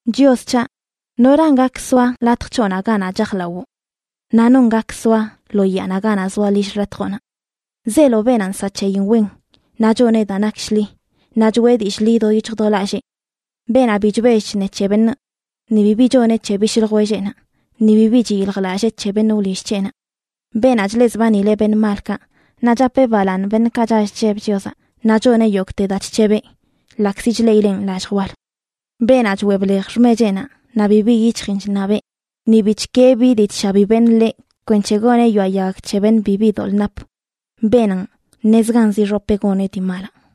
Chios c̱haꞌ, ¿noran gak soa latj c̱hoꞌnaꞌ ganaꞌ chajlawoꞌ? Naꞌ ¿non gak soa lo yaanaꞌ ganaꞌ zoa lill xḻatjoꞌnaꞌ? Zeelo beenaꞌ nsaꞌ c̱heyin wen naꞌ choneꞌ daa nak shḻi, naꞌ choꞌe dillꞌ ḻi do yic̱hj do lallee; beenaꞌ bi chbell chṉe c̱he beṉꞌ, ni bibi choneꞌ c̱he bishꞌ ljwelleꞌnaꞌ, ni bibi chiyiljlallee c̱he beṉꞌ wlill c̱heꞌnaꞌ; beenaꞌ chleꞌzbanileꞌ beṉꞌ malkaꞌ, naꞌ chapeꞌ balaaṉ beṉꞌkaꞌ chall chlleb Chiozaꞌ; naꞌ choneꞌ yogꞌte daa chc̱hebeꞌ, ḻaꞌkzi chleꞌileꞌn lallj wal; beenaꞌ choꞌe blej xmecheꞌnaꞌ naꞌ bibi yic̱hjin chṉabeꞌ; ni bi chkee bi dii chshabi beṉꞌ ḻeꞌ kwenc̱he goneꞌ yoaꞌ yag c̱he beṉꞌ bibi doḻꞌ nap. Beenanꞌ, ṉezganzə ixopeꞌ goneꞌ dii malaꞌ.